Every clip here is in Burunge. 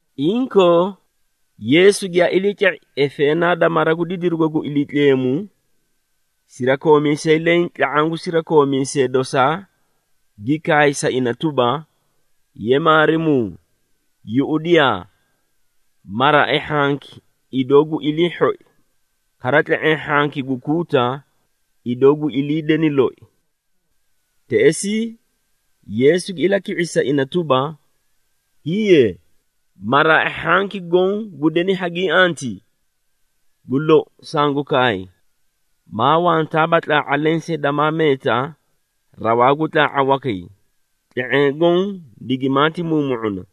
Inkoo, Yeesu giyaa iliica⁄i efeenaa da mara gu didirugo gu Iliitleemu, sirakoomiisay leẽ tla⁄aã gu sirakoomiisee dosaa gi kaay sa ina tuba, “Ye Maarimuu, yuꞌudiyaa! Maraai hhanki idoo gu ilii hhoi, kara tle⁄eẽ hhanki gu kuuta idoo gu ilii deni loi!” Teꞌesii Yeesu gi ilaki⁄isi sa ina tuba, “Hiiye! Maraai hhanki goõ gu deni hagiĩ antii? Gu lou sangu kaay, maa wantaaba tlaa⁄a lensee damaa meeta rawaa gu tlaa⁄a wakay, tle⁄eẽ goõ digimaati muumu⁄una.”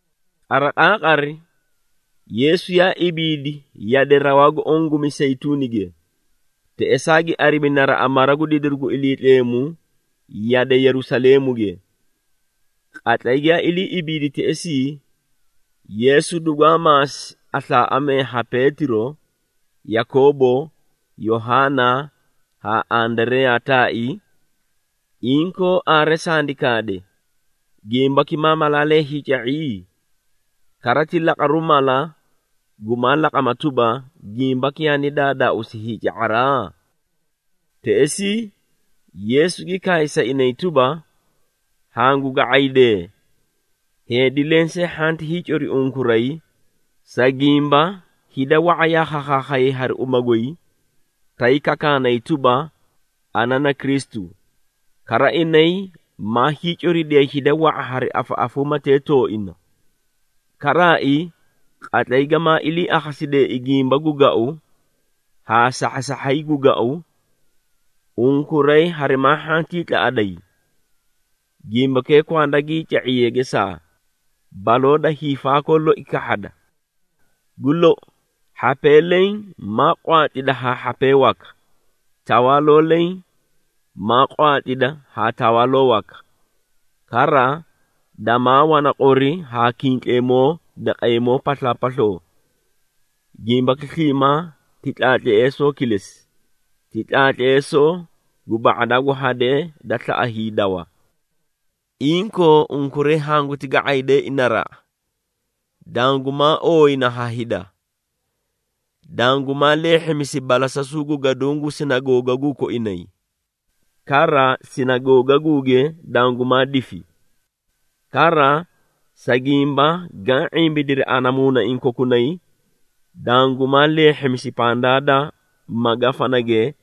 Qariqaaqari Yeesu yaa ibiidi yade rawaa gu oõ gu Miseyituunige. Teꞌesaa gi arimi naraꞌa mara gu didiru gu Iliitleemu yade Yerusaleemuge. Qatlay giyaa ilii ibiidi teꞌesii, Yeesu dugwaa maasi aslaaꞌamee ha Peetiro, Yakoobo, Yohaana haa Andareyaa taai, “Inkoo aare sandi kaade, gimbaki maa malaalee hiica⁄i? Kara, ti laqaru mala gumaa laqama tuba, gimbaki yaani daadaauusi hiica⁄araa?” Teꞌesii Yeesu gi kaay sa inay tuba, “Hangu ga⁄aydee, heedi lensee hhanti hiicori unkuray, sa gimba, hida wa⁄a yaa khakhayay hari uma goy, tay kakaanay tuba, ‘Ana na Kristu,’ kara inay maa hiicoridiyay hida wa⁄a hari afaꞌafuumatee tooina. Karaai, qatlay gamaa ilii akhasideei gimba gu gau haa sahhasahhay gu gau, unkuray harimaa hhantii tlaꞌaday. Gimbakee kwanda gii ca⁄iye gesaa, baloo da hiifaakoo loi kahhada. Gu lou, Hhapee leẽ maa qwaatlida haa hhapee waka, tawaaloo leẽ maa qwaatlida haa tawaaloo waka. Kara, damaa wana qori haa kintleemoo daqeemoo paslaapasloo. Gimbaki sliimaa ti tlaatleesoo kilesi, ti tlaatleesoo gu ba⁄adaa gu hadee da slaꞌa hiidawa. Inkoo unkuray hanguti ga⁄aydeei naraꞌa! Dangumaa ooyina ha hida, dangumaa leehhimisi balasasuu gu gaduũ gu sinagoogaguu koinay, kara sinagoogaguuge dangumaa difi. Kara, sa gimba gaã ⁄imbidiri ana muunaiĩ kokunay, dangumaa leehhimisi pandaa da magafanage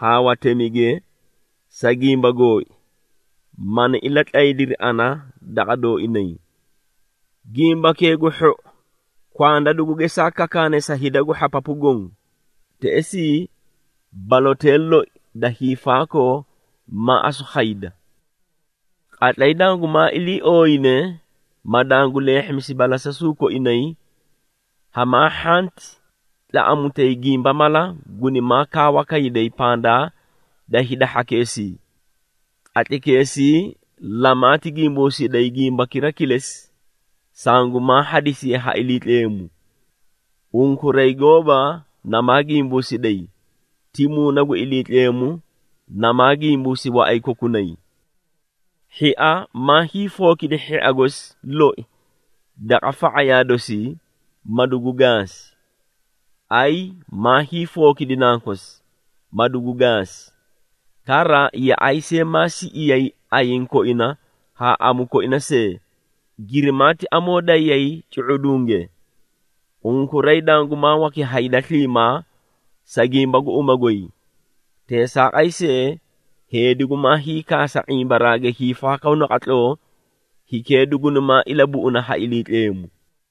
haa watemige, sa gimba gooi, mani ilatlaydiri ana daqa dooinay. Gimbakee gu Hhou kwanda dugu gesaa kakaane sa hida gu hhapapu goõ, teꞌesii balotee loi da hiifaakoo maa asu khayda. Qatlay dangumaa ilii ooyine, ma dangu leehhimisi balasasuu koinay, hamaa hhanti tlaꞌamutay gimba mala gunimaa kaawa kayday pandaa da hida hhakeesii. Qatlaykeesii lamaati gimbuusiday gimbakira kilesi, sangumaa hadisiye ha Iliitleemu. Unkuray gooba namaa gimbuusiday, ti Muuna gu Iliitleemu, namaa gimbuusi waꞌay kokunay. Hhia maa hiifookidi hhia gosi loi daqa fa⁄ayaa dosii, ma dugu gaasi. Ayi maa hiifookidi nankosi, ma dugu gaasi. Kara, yaꞌay see maa siꞌiyay ayiĩ koina haã amu koina see, girimaati amoo dayay cu⁄udunge. Unkuray dangumaa waki ha hida sliimaa, sa gimba gu uma goy. Teesaaqay see, heedi gumaa hiikaasa ⁄imbaraage hiifaakoo naqatloo, hikee dugunimaa ilabuꞌuna ha Iliitleemu.”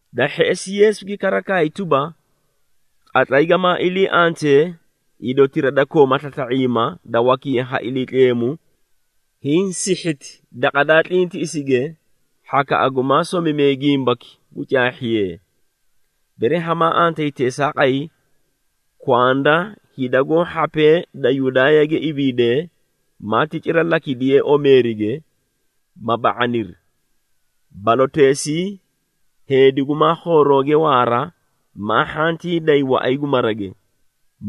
Da hheꞌesi Yeesu gi kara kaay tuba, “Qatlay gamaa ilii antee idotira da kooma slasla⁄iima, da wakiye ha Iliitleemu hiĩ sihhiti daqa daa tlintiꞌisige, hhakaꞌa gumaa somimee gimbaki gu caahhiyee! Bere hamaa antayi teesaaqay, kwanda hida goó hhapee da Yudaayage ibiidee, maati cira lakidiyee omeerige, ma ba⁄aniri. Baloteesii, heedi gumaa khoorooge waara, maa hhantii day waꞌay gu marage,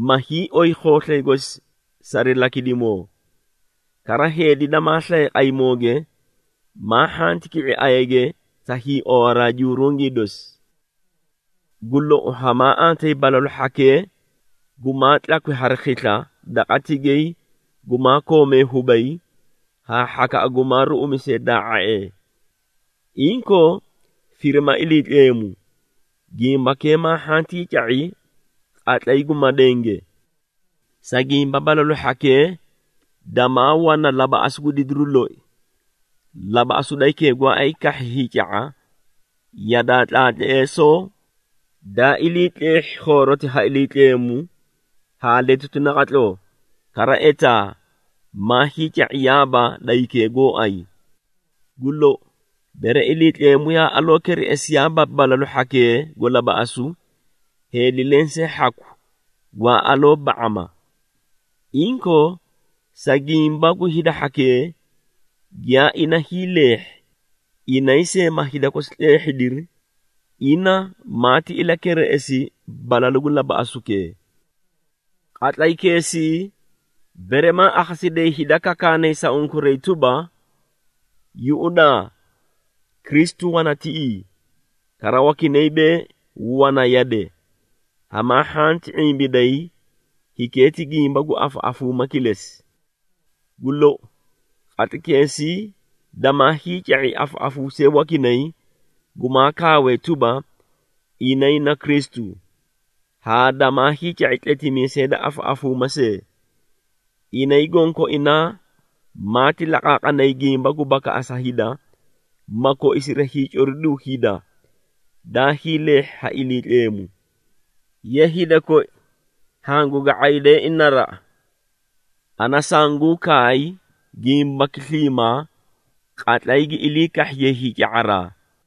ma hiioy khooslay gosi sari lakidimoo. Kara heedi damaa slaye qaymooge, maa hhanti ki⁄i ayage sa hiiowaraa jurungii dosi. Gu lou, hamaa antayi balalu hhakee gumaa tlakwi hari khisla daqa tigay gumaa koomee hubay haa hhakaꞌa gumaa ruꞌumisee daa⁄a⁄ee! Inkoo firima Iliitleemu, gimbakee maa hhantii ca⁄i qatlay gu madenge, Sa gimba balalu hhakee damaa wana labaꞌasu gu didiru loi. Labaꞌasu da hikee gooay kahhi hiica⁄a yadaa tlaatleesoo daa ilii tleehhi khooroti ha Iliitleemu haa letuti naqatloo, kara etaa maa hiica⁄iyaaba da hikee gooay. Gu lou, bere Iliitleemu yaa aloo ilakereꞌesiyaaba balalu hhakee gu labaꞌasu, heedi lensee hhaku gwaa aloo ba⁄ama. Inkoo sa gimba gu hida hhakee giyaa ina hiileehhi, inay see ma hida kosi tleehhidiri, ina maati ilakereꞌesi balalu gu labaꞌasukee. Qatlaykeesii, bere maa akhasidayi hida kakaanay sa unkuray tuba, ‘Yuꞌudaa, Kristu wana tiꞌii!’ kara wakinay bee, ‘Wana yade!’ hamaa hhanti ⁄imbiday, hikee ti gimba gu afaꞌafuuma kilesi. Gu lou, qatlaykeesii damaa hiica⁄i afaꞌafuusee wakinay gumaa kaawee tuba, inay na Kristu, haa damaa hiica⁄i tletimiisee da afaꞌafuuma see. Inay gonkoinaa maati laqaaqanay gimba gu bakaꞌasa hida, ma koisiri hiicoriduu hida daa hiileehhi ha Iliitleemu. Ye hida koi, hangu ga⁄aydeei naraꞌa! Ana sanguũ kaay gimbaki sliimaa, qatlay gi ilii kahhiye hiica⁄araa.”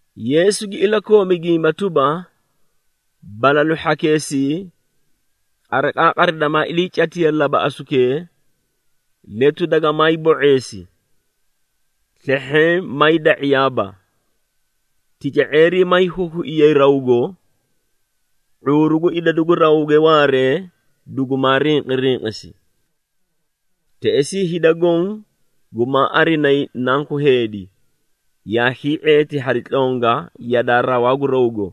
Yeesu gi ilakoomi gimba tuba, “Balalu hhakeesii, qariqaaqari damaa iliicatiye labaꞌasukee, ‘Letu dagamaay bo⁄eesi. Slehheẽ maay da⁄iyaaba, tica⁄eerii maay huhuiyay rawgo, ⁄uuru gu idadu gu rawge waaree, dugumaa rinqirinqisi.’ Teꞌesii hida goõ gumaa arinayi Nanku Heedi, yaa hii⁄eeti hari tlonga yadaa rawaa gu rawgo,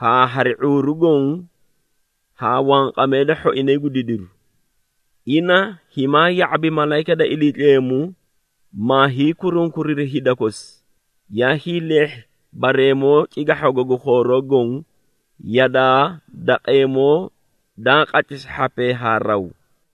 haa hari ⁄uuru goõ haa wanqamee da hhoinay gu didiru. Ina himaa ya⁄abi malayika da Iliitleemu, maa hiikurunkuriri hida kosi giyaa hiileehhi bareemoo cigahhago gu khooroo goõ, yadaa daqeemoo daa qatlisi hhapee haa raw.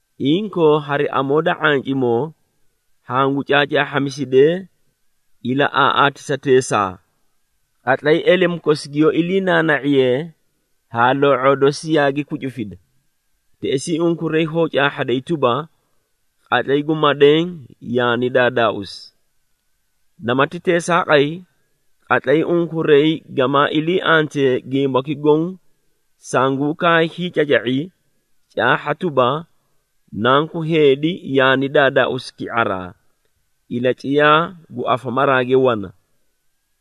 Inkoo, hari amoo da ⁄ancimoo hangu caacaahhamisidee ilaꞌaaꞌaatisateesaa. Qatlay elemu kosi giyoó iliinaana⁄iyee haa loo⁄oo dosi yaagi kucufida, teꞌesii unkuray hoó caahhaday tuba, qatlay gu madeẽ yaani daadaauusi. Namati teesaaqay, qatlay unkuray gamaa ilii antee gimbaki goõ sanguũ kaay hiicaca⁄i, caahha tuba, Nanku Heedi yaani daadaauusi ki⁄araa, ilaciyaa gu afamaraage wana.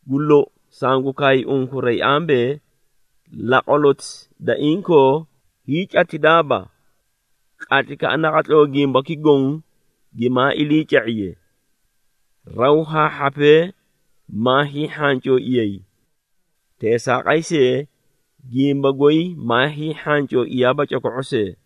Gu lou, sangu kaay unkuray ambee, laqwaloti da inkoo hiicatidaaba, qatlaykaꞌa naqatloo gimbaki goõ gimaa iliica⁄iye. Raw haa hhapee maa hiihhancooiyay. Teesaaqay see, gimba goy maa hiihhancooiyaaba coko⁄o see.”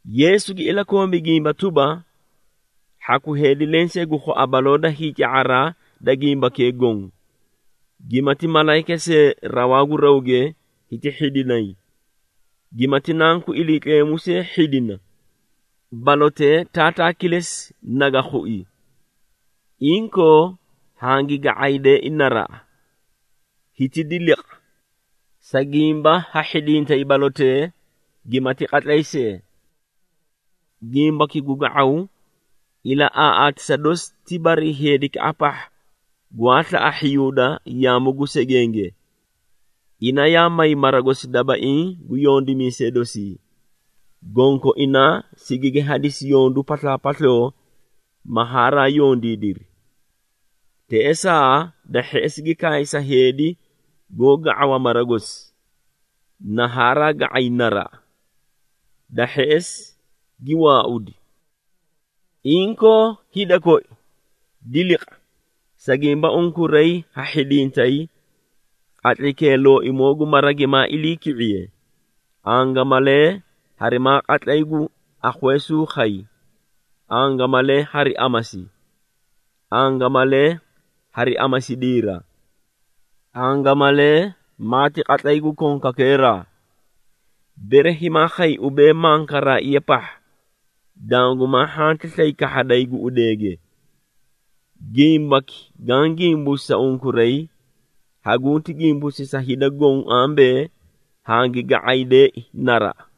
Yeesu gi ilakoomi gimba tuba, “Hhaku heedi lensee gu khua baloo da hiica⁄araa da gimbakee goõ, gimati malayika see rawaa gu rawge hiti hhidinay, gimati Nanku Iliitleemu see hhidina, balotee Taataa kilesi naga khui. Inkoo, hangi ga⁄aydeei naraꞌa! Hiti diliqa! Sa gimba ha hhidintay balotee gimati qatlay see. Gimbaki gu ga⁄aw, ilaꞌaaꞌatisa dosi ti barii heedikaꞌa pahha gwaa slaꞌa hhiyuuda yaamu gu segenge. Ina yaa may mara gosi dabaiĩ gu yondimiisee dosii, gonkoinaa sigigi hadisi yondu paslaapasloo, ma haraa yondiidiri. Teꞌesaa da hheꞌesi gi kaay sa heedi goó ga⁄awa mara gosi, na haraa ga⁄ay naraꞌa. Da hheꞌesi gi waaudi. Inkoo hida koi, diliqa, sa gimba unkuray ha hhidintay qatlaykee looimoo gu mara gimaa iliiki⁄iye, angamalee harimaa qatlay gu akhweesuu khay, angamalee hari amasi, angamalee hari amasidiira, angamalee maati qatlay gu konkakeeraa. Bere himaa khay ubee, mankaraaiya pahha, dangumaa hhanti slay kahhaday guꞌudeege. Gimbaki gaã gimbuusi sa unkuray, hagunti gimbuusi sa hida goõ ambee, ‘Hangi ga⁄aydeei naraꞌa!’”